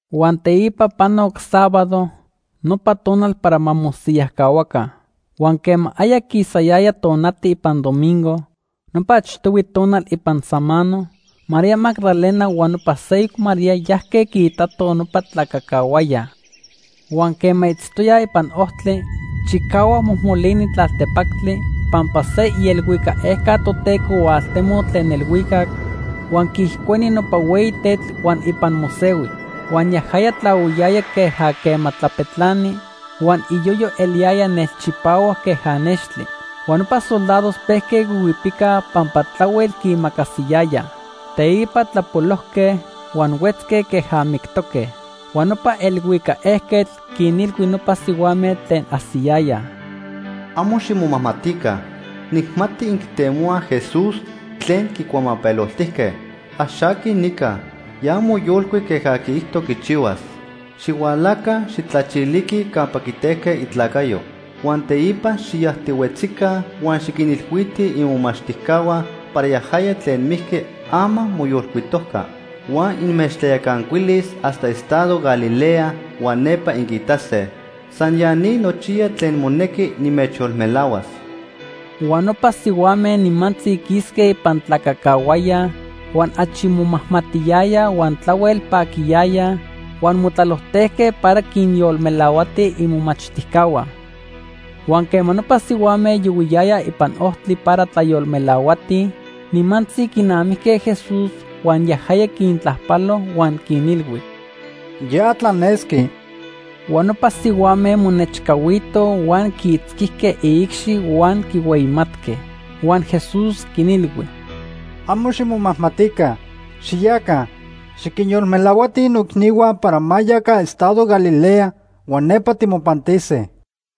Huan teipa panoc sábado, nopa tonal para ma mosiyajcahuaca. Huan quema aya quisayaya tonati ipan domingo nopa achtohui tonal ipan samano, María Magdalena huan nopa seyoc María yajque quiitato nopa tlacacahuaya. Huan quema itztoyaj ipan ojtli, chicahuac mojmolini tlaltepactli pampa se ielhuicac ejca Toteco hualtemoc tlen elhuicac, huan quiijcueni nopa hueyi tetl huan ipan mosehui. Huan yajaya tlahuiyaya queja quema tlapetlani, huan iyoyo eliyaya nelchipahuac queja nextli. Huan nopa soldados pejque huihuipicaj pampa tlahuel quiimacasiyayaj. Teipa tlapolojque huan huetzque queja mictoque. Huan nopa elhuicac ejquetl quinilhui nopa sihuame tlen ajsiyayaj: ―Amo ximomajmatica. Nijmati inquitemohuaj Jesús tlen quicuamapeloltijque. Ax aqui nica. Ya moyolcuic queja quiijto quichihuas. Xihualaca, xijtlachiliquij campa quitejque itlacayo. Huan teipa xiyajtihuetzica huan xiquinilhuitij imomachtijcahua para yajaya tlen mijqui ama moyolcuitojca. Huan inmechtlayacancuilis hasta estado Galilea huan nepa inquiitase. San ya ni nochiya tlen monequi nimechyolmelahuas. Huan nopa sihuame nimantzi quisque ipan tlacacahuaya huan achi momajmatiyayaj huan tlahuel paquiyayaj huan motlalojtejque para quinyolmelahuatij imomachtijcahua. Huan quema nopa sihuame yohuiyayaj ipan ojtli para tlayolmelahuatij, nimantzi quinamijque Jesús huan yajaya quintlajpalo huan quinilhui: ―¡Ya tlanesqui! Huan nopa sihuame monechcahuitoj huan quiitzquijque iicxi huan quihueyimatque. Huan Jesús quinilhui: ―Amo ximomajmatica. Xiyaca, xiquinyolmelahuatij noicnihua para ma yaca estado Galilea huan nepa timopantise.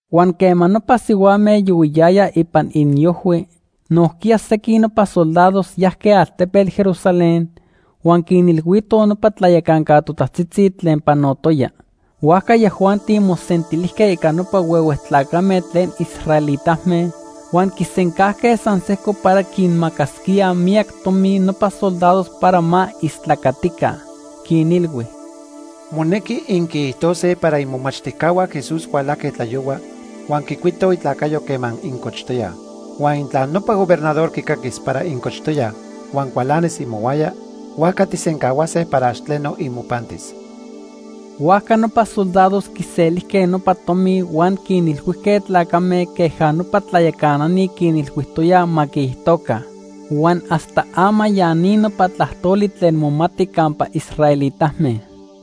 Huan quema nopa sihuame yohuiyayaj ipan iniojhui, nojquiya sequin nopa soldados yajque altepetl Jerusalén huan quinilhuitoj nopa tlayacanca totajtzitzi tlen panotoya. Huajca yajuanti mosentilijque ica nopa huehue tlacame tlen israelitame huan quisencajque san sejco para quinmacasquíaj miyac tomi nopa soldados para ma istlacatica. Quinilhui: ―Monequi inquiijtose para imomachtijcahua Jesús hualajque tlayohua huan quicuitoj itlacayo quema incochtoyaj. Huan intla nopa gobernador quicaquis para incochtoyaj huan cualanis imohuaya, huajca tijsencahuase para ax tleno imopantis. Huajca nopa soldados quiselijque nopa tomi huan quinilhuijque tlacame queja nopa tlayacanani quinilhuijtoyaj ma quiijtoca. Huan hasta ama ya ni nopa tlajtoli tlen momati campa israelitame.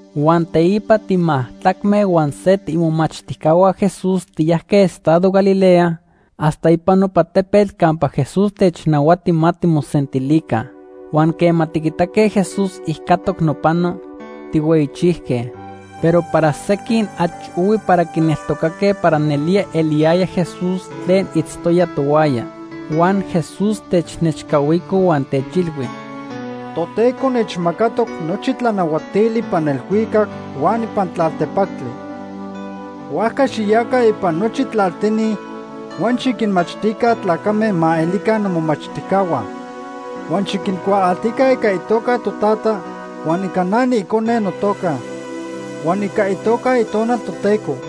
Huan teipa timajtlacme huan se tiimomachtijcahua Jesús tiyajque estado Galilea hasta ipan nopa tepetl campa Jesús technahuati ma timosentilica. Huan quema tiquitaque Jesús ijcatoc nopano, tijhueyichijque, pero para sequin achi ohui para quineltocaque para nelía eliyaya Jesús tlen itztoya tohuaya. Huan Jesús technechcahuico huan techilhui: ―Toteco nechmacatoc nochi tlanahuatili ipan elhuicac huan ipan tlaltepactli. Huajca xiyaca ipan nochi tlaltini huan xiquinmachtica tlacame ma elica nomomachtijcahua. Huan xiquincuaaltica ica itoca Totata, huan ica na niIcone notoca, huan ica itoca Itonal Toteco.